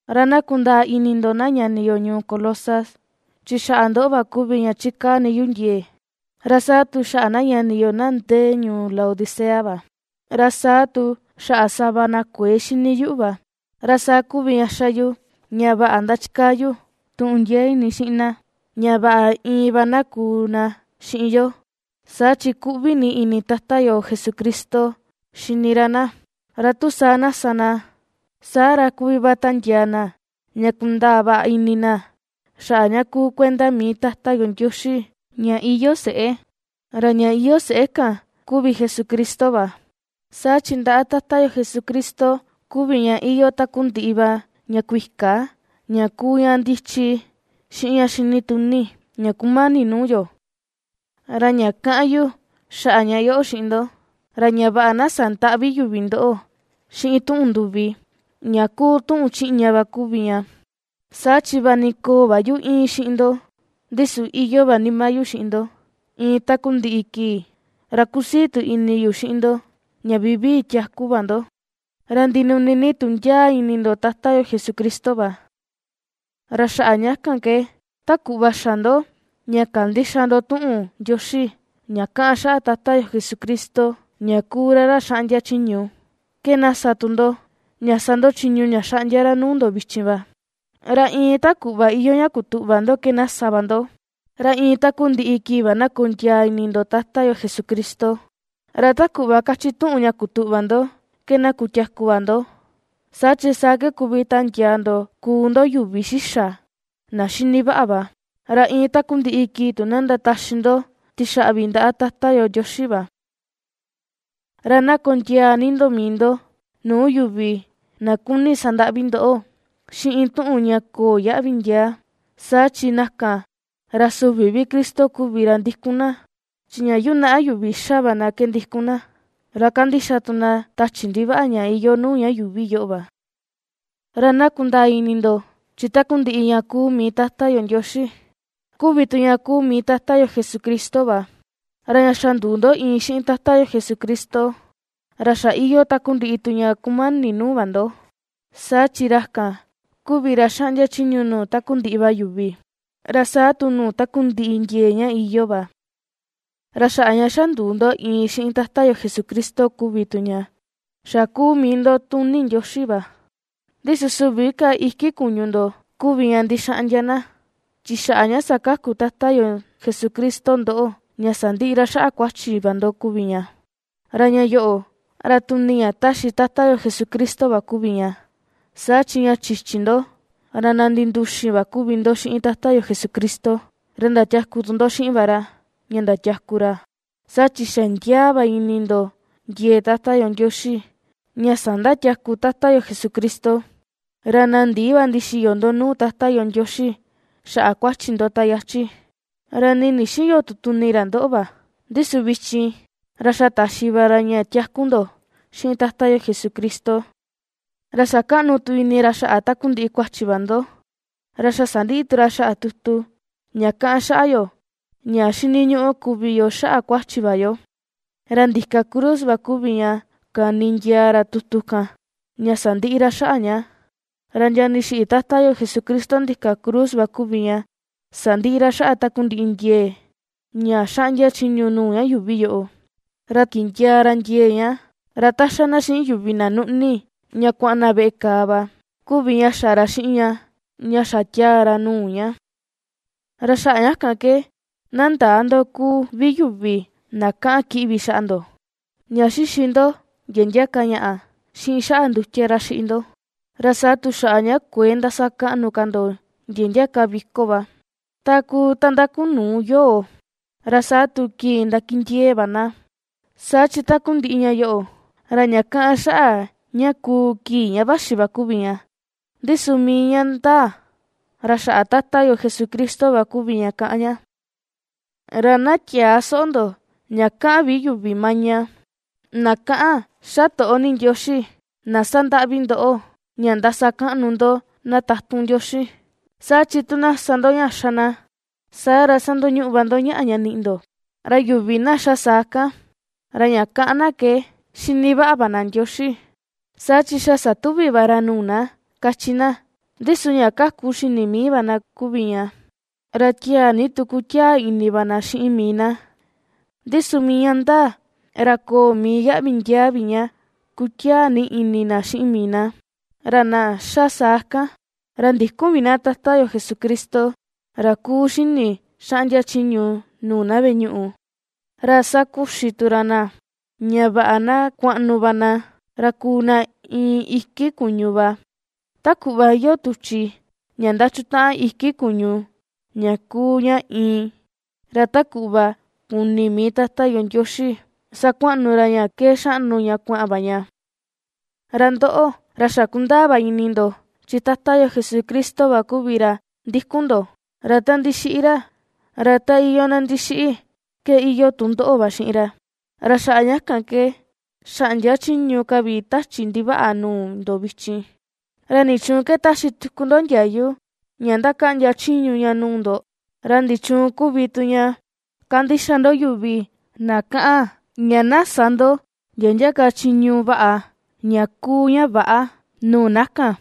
Ra na kundaa ini ndoꞌo na ñani yo ñuu Colosas, chi xaꞌa ndoꞌo va kuvi ña chikaa ni yu ndiee, ra saa tu xaꞌa na ñani yo na ndee ñuu Laodicea va, ra saa tu xaꞌa sava na kuëe xini yuꞌu va. Ra saa kuvi ña ^xa yu ña vaꞌa ndachikaa yu tuꞌun ndiee ini xiꞌin na, ña vaꞌa iin va na kuu na xiꞌin yo, saa chi kuꞌvi ni ini Tata yo Jesucristo xini ra na. Ra tu saa na sa na, saa ra kuvi va tandiaa na ña kundaa vaꞌa ini na xaꞌa ña kuu kuenda mii Tata yo Ndioxi ña iyoo seꞌé, ra ña iyoo seꞌé kan kuvi Jesucristo va. Saa chi ndaꞌa Tata yo Jesucristo kuvi ña iyoo takundiꞌi va ña kuika ña kuu ña ndichi, xiꞌin ña xinituni, ña kumani nuu yo. Ra ña kaꞌan yu xaꞌa ña yoꞌo xiꞌin ndo, ra ña vaꞌa na sandäꞌvi yuvi ndoꞌo xiꞌin tuꞌun nduvi, ña kuu tuꞌun chiꞌña va kuvi ña. Saa chi vaꞌa ni köo va yu íin xiꞌin ndo, ndi su iyoo va nima yu xiꞌin ndo, iin takundiꞌi kii, ra kusii tu ini yu xiꞌin ndo ña vivii tiaku va ndo, ra ndinuni ni tu ndiaa ini ndo Tata yo Jesucristo va. Ra xaꞌa ña kan ke, ta kuꞌva xa ndo ña kandixa ndo tuꞌun Ndioxi ña kaꞌan xaꞌa Tata yo Jesucristo ña kuu ra ra xaꞌndia chiñu, ke na sa tu ndo, ña sa ndo chiñu ña xaꞌndia ra nuu ndo vichin va. Ra iin ta kuꞌva iyoo ña kutuꞌva ndo ke na sa va ndo, ra iin takundiꞌi kii va na kondiaa ini ndo Tata yo Jesucristo, ra ta kuꞌva kachi tuꞌun ña kutuꞌva ndo ke na kutiaku va ndo, saa chi saa ke kuvi tandiaa ndo kuu ndo yuvi xixa, na xini vaꞌa va, ra iin takundiꞌi kii tu na ndataxi ndo tixaꞌvi ndaꞌa Tata yo Ndioxi va. Ra na kondiaa ni ndo mii ndo nuu yuvi na kuni sandaꞌvi ndoꞌo xiꞌin tuꞌun ña köo yaꞌvi ndiaa. Saa chi na kan, ra süvi vi Cristo kuvi ra ndikun na, chi ña yunaꞌa yuvi ^xa va na va ke ndikun na, ra kandixa tu na tachi ndivaꞌa ña iyoo nuu ña yuuvi yoꞌo va. Ra na kundaa ini ndo, chi takundiꞌi ña kuu mii Tata yo Ndioxi, kuvi tu ña kuu mii Tata yo Jesucristo va, ra ña xa nduu ndo iin xiꞌin Tata yo Jesucristo, ra xa iyoo takundiꞌi tu ña kumani nuu va ndo, saa chi ra kan, kuvi ra xaꞌndia chiñu nuu takundiꞌi va yuvi, ra saa tu nuu takundiꞌi ndiee ña iyoo va. Ra xaꞌa ña xa nduu ndo iin xiꞌin Tata yo Jesucristo kuvi tu ña, xa kuu mii ndo tuni Ndioxi va; ndi su süvi ka iki kuñu ndo kuvi ña ndixaꞌndia na, chi xaꞌa ña sakaku Tata yo Jesucristo ndoꞌo ña sandiꞌi ra xaꞌa kuachi va ndo kuvi ña. Ra ña yoꞌo, ra tuni ña ^taxi Tata yo Jesucristo va kuvi ña. Saa chi ña chichi ndo, ra na ndinduxin va kuvi ndo xiꞌin Tata yo Jesucristo, ra ndatiaku tu ndo xiꞌin va ra, ña ndatiaku ra, saa chi xa ndiaa va ini ndo ndiee Tata yo Ndioxi ña sandatiaku Tata yo Jesucristo. Ra na ndii va ndixiyo ndo nuu Tata yo Ndioxi xaꞌa kuachi ndo ta yachi, ra nii ndixïyo tu tuni ra ndoꞌo va; ndi su vichin, ra xa taxi va ra ña tiaku ndo, xiꞌin Tata yo Jesucristo, ra xa kaꞌnu tu ini ra xaꞌa takundiꞌi kuachi va ndo. Ra xa sandiꞌi tu ra xaꞌa tutu ña kaꞌan xaꞌa yo ña xiniñuꞌu kuvi yo xaꞌa kuachi va yo. Ra ndika cruz va kuvi ña kani ndiaa ra tutu kan, ña sandiꞌi ra xaꞌa ña. Ra ña ndixiꞌi Tata yo Jesucristo ndika cruz va kuvi ña sandiꞌi ra xaꞌa takundiꞌi ndiee, ña xaꞌndia chiñu nuu ña yuuvi yoꞌo, ra kindiaa ra ndiee ña, ra ta ^xa na xiꞌin yuvi na nuꞌni ña kuaꞌan na veꞌe kàà va, kuvi ña xa ra xiꞌin ña, ña xa tiaa ra nuu ña. Ra xaꞌa ña kan ke, na ndäa ndo kuu vi yuvi na kaꞌan kiꞌvi xaꞌa ndo, ña xixi ndo ndia ndia ka ñaꞌa, xiꞌin xaꞌa ndutia ra xiꞌi ndo, ra saa tu xaꞌa ña kuëe ndasakaꞌnu ka ndo ndia ndia ka viko va, ta kuu ta ndakunuu yoo, ra saa tu kii ndakindiee va na. Saa chi takundiꞌi ña yoꞌo, ra ña kaꞌan xaꞌa ña kuu kii ña vaxi va kuvi ña, ndi su mii ña ndaa, ra xaꞌa Tata yo Jesucristo va kuvi ña kaꞌan ña. Ra na tiäa soꞌo ndo ña kaꞌan vi yuvi maña, na kaꞌan xa toꞌo ni Ndioxi, na sandaꞌvi ndoꞌo, ña ndasakaꞌnu ndo na tatun Ndioxi, saa chi tu na sa ndo ña xa na, saa ra, sandoñuꞌu va ndo ñaꞌa ña niꞌi ndo. Ra yuvi na ^xa saa kan, ra ña kaꞌan na ke xini vaꞌa va na Ndioxi, saa chi xa satuvi va ra nuu na, kachi na, ndi su ña kaku xini mii va na kuvi ña, ra tiaa ni tu kutiaa ini va na xiꞌin mii na, ndi su mii ña ndaa, ra köo mii yaꞌvi ndiaa vi ña kutiaa ni ini na xiꞌin mii na. Ra na ^xa saa kan, ra ndïkun vi na Tata yo Jesucristo, ra kuu xini xaꞌndia chiñu nuu na veꞌe ñuꞌu, ra ^sakuxi tu ra na, ña vaꞌa na kuaꞌnu va na, ra kuu na iin iki kuñu va, ta kuꞌva iyoo tuchi ña ndachutaꞌan iki kuñu ña kuu ña iin, ra ta kuꞌva kuni mii Tata yo Ndioxi sakuaꞌnu ra ña ke xaꞌnu ña kuaꞌan va ña. Ra ndoꞌo, ra xa kundaa va ini ndo, chi Tata yo Jesucristo va kuvi ra ndikun ndo, ra ta ndixiꞌi ra, ra ta iyoo na ndixiꞌi ke iyoo tu ndoꞌo va xiꞌin ra. Ra xaꞌa ña kan ke xäꞌndia chiñu ka vi tachi ndivaꞌa nuu ndo vichin. ¿Ra nichuun ke ^taxi tuku ndo ndiayu ña ^ndakaꞌndia chiñu ña nuu ndo? ¿Ra nichuun kuvi tu ña ^kandixa ndo yuvi na kaꞌan ña na sä ndo ndia ndia ka chiñu vaꞌa, ña kuu ña väꞌa nuu na kan,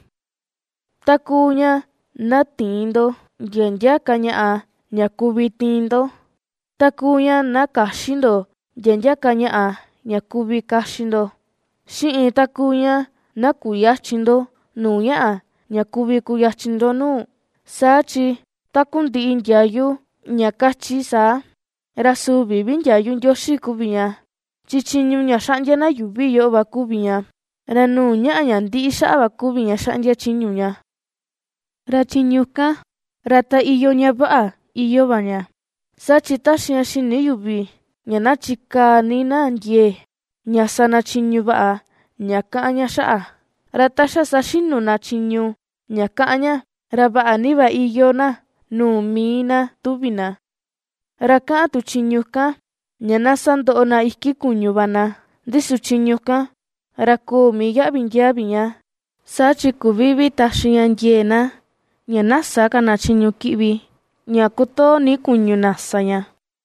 ta kuu ña na tïin ndo ndia ndia ka ñaꞌa ña kuvi tiin ndo, ta kuu ña na käxi ndo ndia ndia ka ñaꞌa ña kuvi kaxi ndo, xiꞌin ta kuu ña na kuyächin ndo nuu ñaꞌa, ña kuvi kuyachin ndo nuu? Saa chi takundiꞌi ndiayu ña kachi saa, ra süvi vi ndiayu Ndioxi kuvi ña, chi chiñu ña xaꞌndia na yuuvi yoꞌo va kuvi ña; ra nuu ñaꞌa ña ndiꞌi xaꞌa va kuvi ña xaꞌndia chiñu ña. Ra chiñu kan, ra ta iyoo ña vaꞌa, iyoo va ña, saa chi ^taxi ña xini yuvi ña na chikaa ni na ndiee ña sa na chiñu vaꞌa ña kaꞌan ña xaꞌa, ra ta xa saxinu na chiñu ña kaꞌan ña, ra vaꞌa ni va iyoo na nuu mii na tuvi na. Ra kaꞌan tu chiñu kan ña na sandoꞌo na iki kuñu va na. Ndi su chiñu kan, ra köo mii yaꞌvi ndiaa vi ña, saa chi küvi vi taxi ña ndiee na ña na sä ka na chiñu kiꞌvi ña kotoo ni kuñu na sa ña.